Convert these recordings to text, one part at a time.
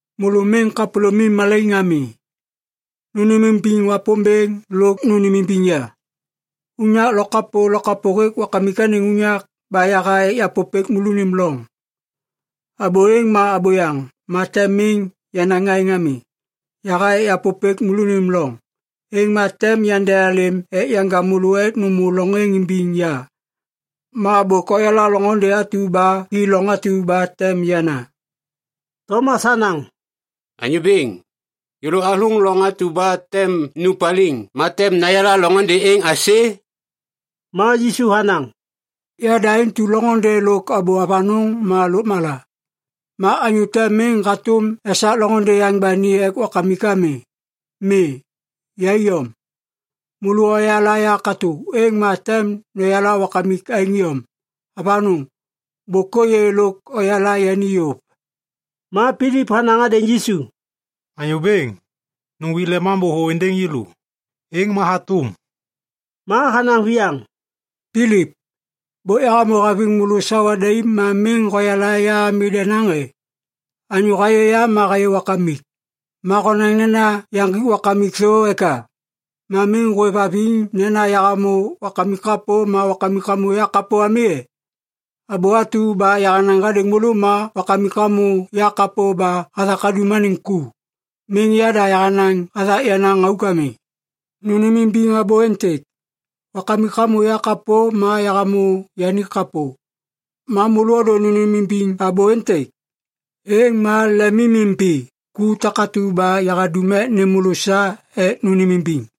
“Môlô miŋ kapôlômim malaiŋ ami. Nônêmimbiŋ Wapômbêŋ lôk nônêmimbiŋ ya. Unyak lokapô lokapô hêk Wakamik anêŋ unyak ba yaha ek yapôpêk môlônim loŋ. Abô êŋ ma abôyaŋ, ma tem miŋ yanaŋ aêŋ ami. Yaha ek yapôpêk môlônim loŋ. Êŋ ma tem yandealêm ek yanja môlô ek nômô loŋ êŋ imbiŋ ya. Ma bôk oyala loŋôndê atu ba hi loŋ atu ba tem yana.” Tomas hanaŋ, “Anyô Bêŋ, yêlô athôŋ loŋ atu ba tem nu paliŋ ma tem nayala loŋôndê êŋ aisê?” Ma Yisu hanaŋ, “Yada intu loŋôndê lôk abô avanôŋ ma lôkmala. Ma anyô te miŋ hatôm esak loŋôndê yaŋ ba ni ek Wakamik ami. Mi. Ya iyom. Môlô oyala ya katô, êŋ ma tem noyala Wakamik aêŋ iyom. Avanôŋ! Bôk ôyê lôk oyala yani yôv!” Ma Pilip hanaŋ hadêŋ Yisu, “Anyô Bêŋ, nuŋgwik Lemambô thô êndêŋ yêlô. Êŋ ma hatôm.” Ma hanaŋ viyaŋ, “Pilip, bôk yahamô haviŋ môlô sawa daim ma miŋ hoyala ya ami denaŋ e? Anyô hayê ya ma hayê Wakamik. Ma honaŋ nena yaŋgik Wakamik thô eka? Ma miŋ hôêvhaviŋ nena yahamô Wakamik kapô ma Wakamik hamô yakapô ami e? Abô atu ba yahanaŋ hadêŋ môlô ma Wakamik hamô ya kapô ba hathak hadum anêŋ ku. Miŋ yada yahanaŋ hathak yenaŋ auk ami. Nônêmimbiŋ abô êntêk! Wakamik hamô ya kapô ma yahamô yani kapô. Ma môlô ôdô nônêmimbiŋ abô êntêk, êŋ ma lemimimbi ku takatu ba yahadum ek nêm môlô sa ek nônêmimbiŋ!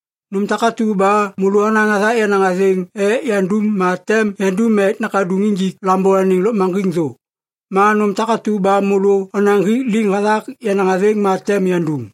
Nôm takatu ba môlô onaŋ hathak yenaŋ athêŋ ek yandum ma tem yandum ek Nakaduŋ injik Lambô anêŋ lôkmaŋgiŋ thô. Ma nôm takatu ba môlô onaŋ hik liŋ hathak yenaŋ athêŋ ma tem yandum.”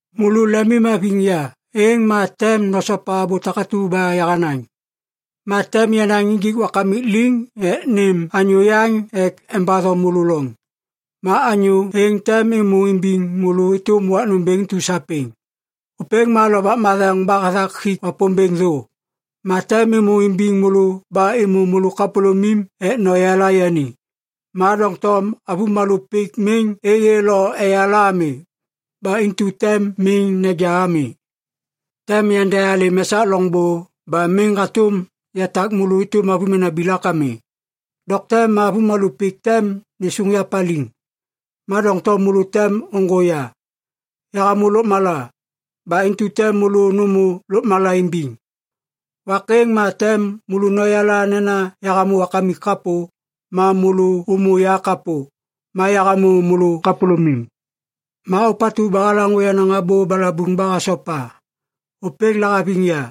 “Môlô lemimhaviŋ ya, êŋ ma tem nosopa abô takatu ba yahanaŋ. Ma tem yanaŋ injik Wakamik liŋ ek nêm anyô yaŋ ek embatho môlô loŋ. Ma anyô êŋ tem êmô imbiŋ môlô êtôm wak nômbêŋ intu sapêŋ. Ôpêŋ ma Lovak Matheŋ ba hathak hik Wapômbêŋ thô. Ma tem êmô imbiŋ môlô ba êmô môlô kapôlômim ek noyala yani. Ma doŋtom avômalô pik miŋ êyê lo eyala ami. Ba intu tem miŋ neja ami. Tem yandealêm esak loŋbô ba miŋ hatôm yatak môlô êtôm avômena bilak ami. Dokte ma avômalô pik tem nêsôŋ ya paliŋ. Ma doŋtom môlô tem ôŋgô ya. Yahamô lôkmala. Ba intu tem môlô nômô lôkmala imbiŋ. Wak êŋ ma tem môlô noyala nena yahamô Wakamik kapô, ma môlô ômô ya kapô, ma yahamô môlô kapôlômim. Ma ôpatu ba halaŋô yenaŋ abô balabuŋ ba hasopa, ôpêŋ lahaviŋ ya.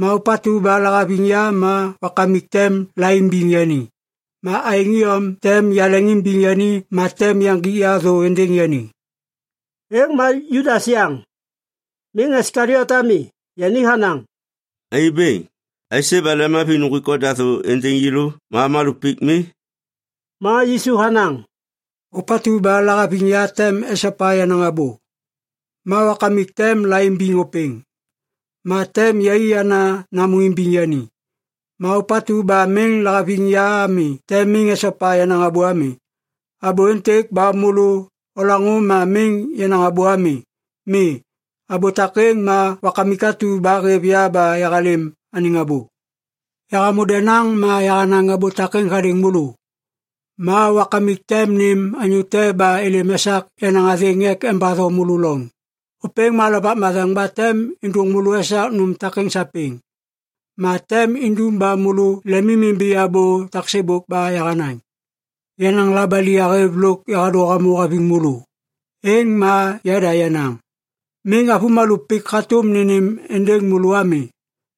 Ma ôpatu ba lahaviŋ ya ma Wakamik tem laimbiŋ yani. Ma aêŋ iyom tem yaleŋimbiŋ yani ma tem yaŋgik ya thô êndêŋ yani.” Êŋ ma Judas yaŋ, miŋ Iskaliot ami, yani hanaŋ, “Anyô Bêŋ, aisê ba lemhaviŋ nuŋgwik oda thô êndêŋ yêlô ma avômalô pik mi?” Ma Yisu hanaŋ, “Ôpatu ba lahaviŋ ya tem esopa yenaŋ abô. Ma Wakamik tem laimbiŋ ôpêŋ, ma tem yai ana namô imbiŋ yani. Ma ôpatu ba miŋ lahaviŋ ya ami tem miŋ esopa yenaŋ abô ami. Abô êntêk ba môlô olaŋô ma miŋ yenaŋ abô ami. Mi. Abô takêŋ ma Wakamik atu ba hêv ya ba yahalêm anêŋ abô. “Yahamô denaŋ ma yahanaŋ abô takêŋ hadêŋ môlô. Ma Wakamik tem nêm anyô te ba êlêm esak yenaŋ athêŋ ek embatho môlô loŋ. Ôpêŋ ma Lovak Matheŋ ba tem êndôŋ môlô esak nôm takêŋ sapêŋ. Ma tem indum ba môlô lemimimbi abô taksêbôk ba yahanaŋ. Yenaŋ labali yahêv lôk yahadô hamô haviŋ môlô. Êŋ ma yada yenaŋ. Miŋ avômalô pik hatôm nênêm êndêŋ môlô ami.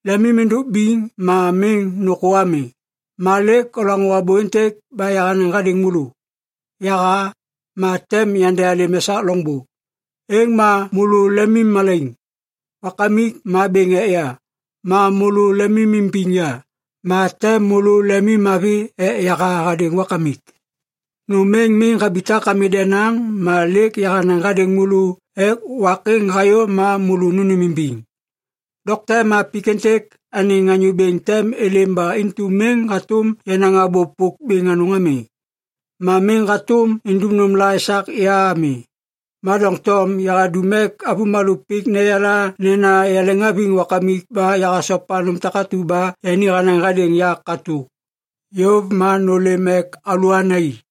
Lemim êndôk biŋ ma miŋ nôkô ami. “Ma lêk olaŋô abô êntêk ba yahanaŋ hadêŋ môlô, ‘Yaha. Ma tem yandealêm esak loŋbô.’ Êŋ ma môlô lemimmalaiŋ. Wakamik ma bêŋ ek ya. Ma môlô lemimimbiŋ ya, ma tem môlô lemimmavi ek yaha hadêŋ Wakamik. Nôm êŋ miŋ habitak ami denaŋ ma lêk yahanaŋ hadêŋ môlô ek wak êŋ hayô ma môlô nônêmimbiŋ. Dokte ma pik êntêk anêŋ anyô bêŋ tem êlêm ba intu miŋ hatôm yanaŋ abô pôk bêŋ anôŋ ami. Ma miŋ hatôm indum nômla esak ya ami. Ma doŋtom yahadum ek avômalô pik neyala nena yaleŋhaviŋ Wakamik ba yahasopa nôm takatu ba yani hanaŋ hadêŋ ya katô. Yôv ma nôlêm ek alôana i.”